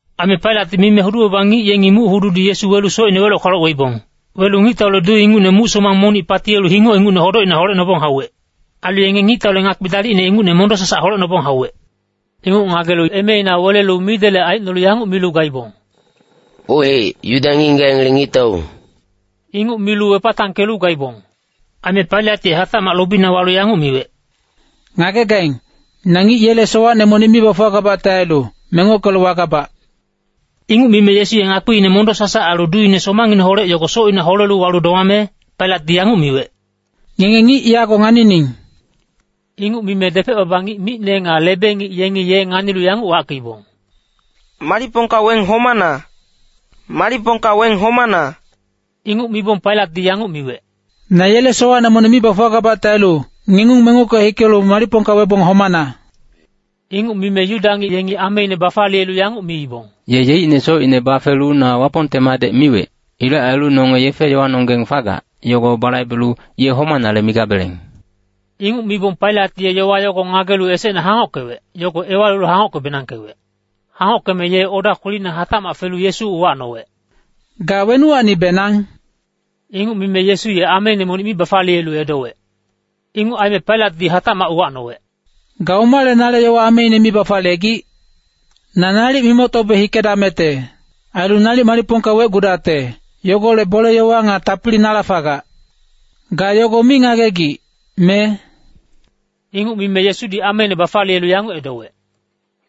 Aime Pailatdi mime hudu-baba ngic yengi muc-hududi Yesu welu socine weloc-kwaloc weibong. Welu ngictaule duu ingucne muc-somang monic patiyelu hingoc ingucne hodocina holecnobong hauwec. Ailu yenge ngictaule ngakpi dalicne ingucne mondo-sasac holecnobong hauwec. Inguc ngagelu emeina welelu midelec aicnolu yanguc milu gaibong, “Ohec, Yuda ngic-ngigac yengele ngictau.” Inguc milu wepatangkelu gaibong. Aime Pailat ye hatacmac lobina walu yanguc miwec, “Ngagegaing, na ngic yele sowacne monic mi bafuwagabacte ailu, mengockelu wagabac.” Inguc mime Yesu ye ngakpiine mondo-sasac ailu duuine somangineholec yogo socina holelu walu domame, Pailatdi yanguc miwec, “Ngenge ngic yago nganining.” Inguc mime depec-baba ngic micne nga lebe-ngic yengi ye nganilu yanguc wackeibong, “Malicpongka weng homana! Malicpongka weng homana!” Inguc mibong Pailatdi yanguc miwec, “Na yele sowacne monic mi bafuwagabacte ailu, ngengung mengocke hikelu malicpongka webong homana.” Inguc mime Yuda ngic yengi ameine bafaliyelu yanguc miibong, “Ye yeicne socine bafelu na Wapongte Madec miwec. Ilec ailu nonge yefe-yowanonggeng fagac, yogo balaibelu ye homanale migabeleng.” Inguc mibong Pailat ye yowa yogo ngagelu esecne hangockewec, yogo ewalilu hangockebenangkewec. Hangockeme ye oda kwelina hatacmac felu Yesu uwacnowec, “Ga wenuwacnibenang?” Inguc mime Yesu ye ameine monic mi bafaliyelu edowec. Inguc aime Pailatdi hatacmac uwacnowec, “Ga omale nale yowa ameine mi bafaliyegic? Na nalic mimoctobe hikedamecte. Ailu nalic malicpongka wecgudacte, yogolec bole-yowa nga tapili nala fagac. Ga yogo mi ngagegic, me?” Inguc mime Yesudi ameine bafaliyelu yanguc edowec,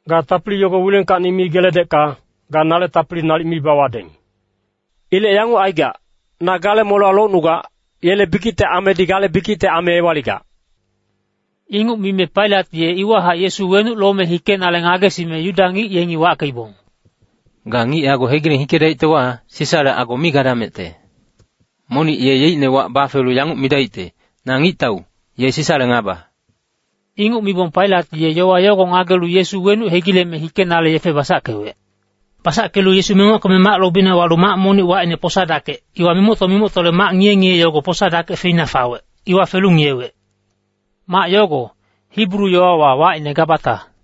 “Ga tapili yogo wilengkacni mi geledecka, ga nale tapili nalic mi bawadeng. Ilec yanguc aigac, na gale molewa locnugac, yele bikicte amedi gale bikicte ame ewaligac.” Inguc mime Pailat ye iwahac Yesu wenuc lome hikenale ngagesime Yuda ngic yengi wackeibong, “Ga ngic yogo hegileng hikedaictewa, Sisale ago mi gadamecte. Monic ye yeicne wac bafelu yanguc midaicte, ‘Na ngictau,’ ye Sisale ngaba.” Inguc mibong Pailat ye yowa yogo ngagelu Yesu wenuc hegileme hikenale yefe basackewec. Basackelu Yesu mengockeme mac lobina walu mac monic wacine Posa-dakec, iwa mimocto-mimoctole mac ngiye-ngiye yogo Posa-dakec feina fawec, iwa felu ngiyewec. Mac yogo, Hibru yowawa wacine Gabata.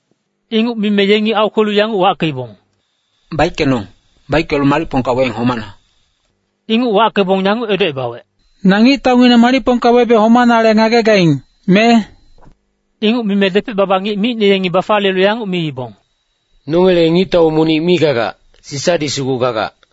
Inguc mime yengi aukwelu yanguc wackeibong, “Baickenong, baickelu malicpongka weng homana!” Inguc wackebong yanguc edocebawec, “Na ngictaungineng malicpongka webe homanale ngagegaing, me?” Inguc mime depec-baba ngic micne yengi bafaliyelu yanguc miibong, “Nongele ngictau monic mi gagac, Sisadi sugu gagac.”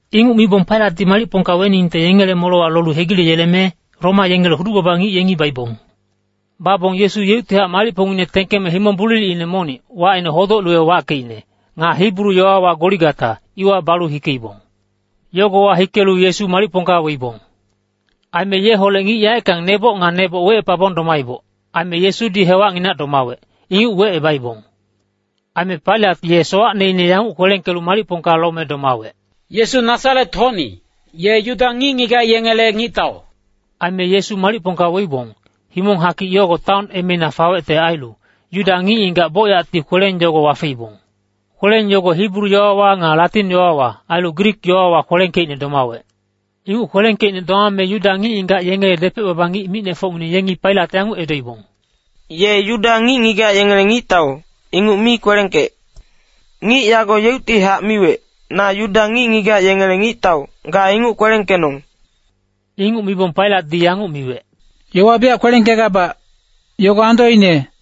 Inguc mibong Pailatdi malicpongka weningte yengele molewa lolu hegileyeleme, Roma yengele hudu-baba ngic yengi baibong. Babong Yesu yeuctihac malicpongngine tengkeme himong bulilicine monic, wacine Hodoc-luwe wackeicne, nga Hibru yowawa Goligata, iwa balu hikeibong. Yogowa hikelu Yesu malicpongka weibong. Aime yeholec ngic yaeckang neboc nga neboc wecepabong domaiboc. Aime Yesudi hewacnginac domawec, inguc wecebaibong. Aime Pailat ye sowacneine yanguc kwelengkelu malicpongka lome domawec, “Yesu Nasaret-hocni, ye Yuda ngic-ngigac yengele ngictau.” Aime Yesu malicpongka weibong, himong-hakic yogo taon emeina fawecte ailu, Yuda ngic-ngigac bocyacti kweleng yogo wafeibong. Kweleng yogo Hibru yowawa nga Latin yowawa, ailu Grik yowawa kwelengkeicne domawec. Inguc kwelengkeicne domame Yuda ngic-ngigac yengele depec-baba ngic micnefocngineng yengi Pailat yanguc edoibong, “ ‘Ye Yuda ngic-ngigac yengele ngictau’, inguc mi kwelengkec. ‘Ngic yago yeuctihac miwec, na Yuda ngic-ngigac yengele ngictau,’ ga inguc kwelengkenong.” Inguc mibong Pailatdi yanguc miwec, “Yowa biyac kwelengkegabac, yogo andoine.”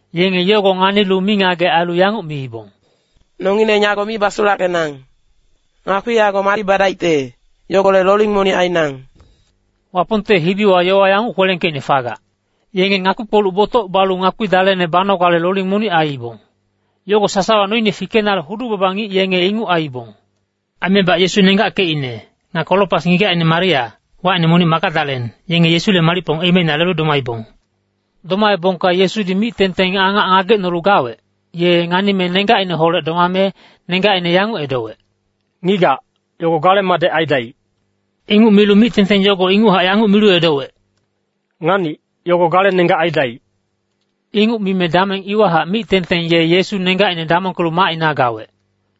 yenge yogo nganilu mingagec ailu yanguc miibong, “Nongileng yago mi basulackenang. Ngakpi yago madi badaicte, yogolec loling monic ainang.” Wapongte hibiwa yowa yanguc kwelengkeicne fagac, “Yenge ngakpi-kpoluc botoc balu ngakpi dalene banogale loling monic aiibong.” Yogo sasawa noine fikenale hudu-baba ngic yenge inguc aiibong. Aimebac Yesu nenggackecine, nga Kolopas ngigacine Maria, wacine monic Magadalen, yenge Yesule malicpong emeina lelu domaibong. Domaebongka Yesudi mic-tengteng angac ngagecnolu gawec, ye nganime nenggacineholec domame, nenggacine yanguc edowec, “Ngigac, yogo gale madec aidaic.” Inguc milu mic-tengteng yogo inguchac yanguc milu edowec, “Nganic, yogo gale nenggac aidaic.” Inguc mime dameng iwahac mic-tengteng ye Yesu nenggacine damongkelu macina gawec.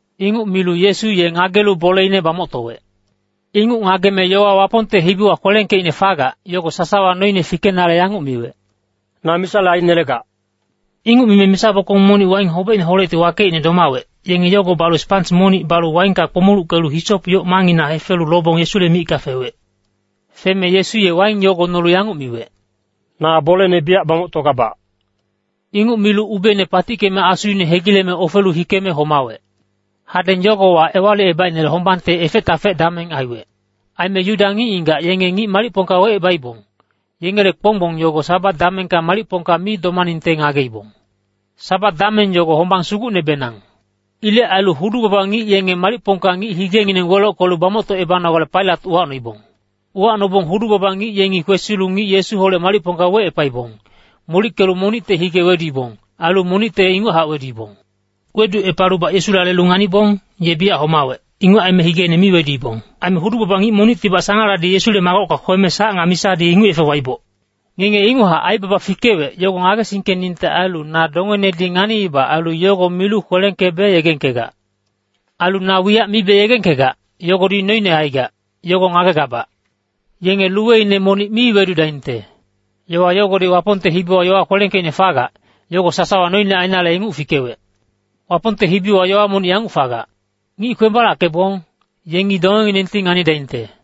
Inguc milu Yesu ye ngagelu boleine bamoctowec. Inguc ngageme yowa Wapongte hibiwa kwelengkeicne fagac, yogo sasawa noine fikenale yanguc miwec, “Na misale ainelegac.” Inguc mime misa bokong monic waing hobecineholecti wakeicne domawec, yenge yogo balu spans monic balu waingka kpomuluckelu hisop yoc mangngina hefelu lobong Yesule micka fewec. Feme Yesu ye waing yogo nolu yanguc miwec, “Na bolene biyac bamoctogabac.” Inguc milu ubeine patickeme asuine hegileme ofelu hikeme homawec. Hadeng yogowa Ewalicebaicnele hombangte efec-tafec dameng aiwec. Aime Yuda ngic-ngigac yenge ngic malicpongka wecebaibong, yengele kponggbong yogo Sabat damengka malicpongka mi domaningte ngageibong. (Sabat dameng yogo hombang sugucnebenang.) Ilec ailu hudu-baba ngic yenge malicpongka ngic higengineng welockelu bamoctocebanogale Pailat uwacnoibong. Uwacnobong hudu-baba ngic yengi kwesilu ngic Yesuholec malicpongka wecepaibong, molickelu monicte hige weduibong, ailu monicte inguchac weduibong. Weducepalubac Yesula lelu nganibong, ye biyac homawec, inguc aime higeine mi weduibong. Aime hudu-baba ngic monictibac sangaladi Yesule magocka kweme sac nga misadi inguc yefe waiboc. Ngenge inguchac aibaba fikewec, yogo ngagesingkeningte ailu na dongenedi nganiiba ailu yogo milu kwelengkebe yegengkegac. Ailu na wiyac mibe yegengkegac, yogodi noine aigac, yogo ngagegabac. “Yenge luweine monic mi wedudaingte.” Yowa yogodi Wapongte hibiwa yowa kwelengkeicne fagac, yogo sasawa noine ainale inguc fikewec. Wapongte hibiwa yowa monic yanguc fagac, “Ngic kwembalackeibong, yengi dongenginengti nganidaingte.”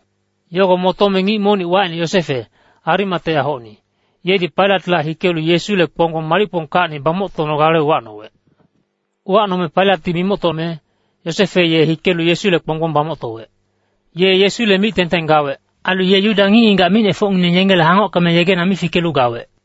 Yogo motome ngic monic wacine Yosefe, Arimateahocni, yedi Pailatla hikelu Yesule kponggbong malicpongkacni bamoctonogale uwacnowec. Uwacnome Pailatdi mimoctome, Yosefe ye hikelu Yesule kponggbong bamoctowec. Ye Yesule mic-tengteng gawec. Ailu ye Yuda ngic-ngigac micnefocngineng yengele hangockeme yegena mi fikelu gawec.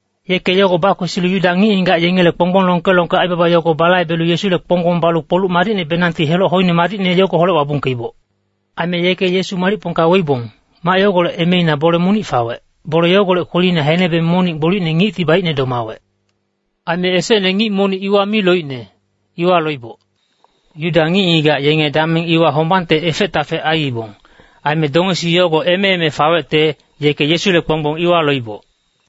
Yeke yogo bakwesilu Yuda ngic-ngigac yengele kponggbong longke-longke aibaba yogo balaibelu Yesule kponggbong balu kpoluc madicnebenangti heloc hoine madicne yogoholec wabungkeiboc. Aime yeke Yesu malicpongka weibong, mac yogolec emeina bole monic fawec, bole yogolec kwelina henebe monic gbolicne ngicti baicne domawec. Aime esecne ngic monic iwa mi loicne, iwa loiboc. Yuda ngic-ngigac yenge dameng iwa hombangte efec-tafec aiibong. Aime dongesi yogo eme-eme fawecte, yeke Yesule kponggbong iwa loiboc.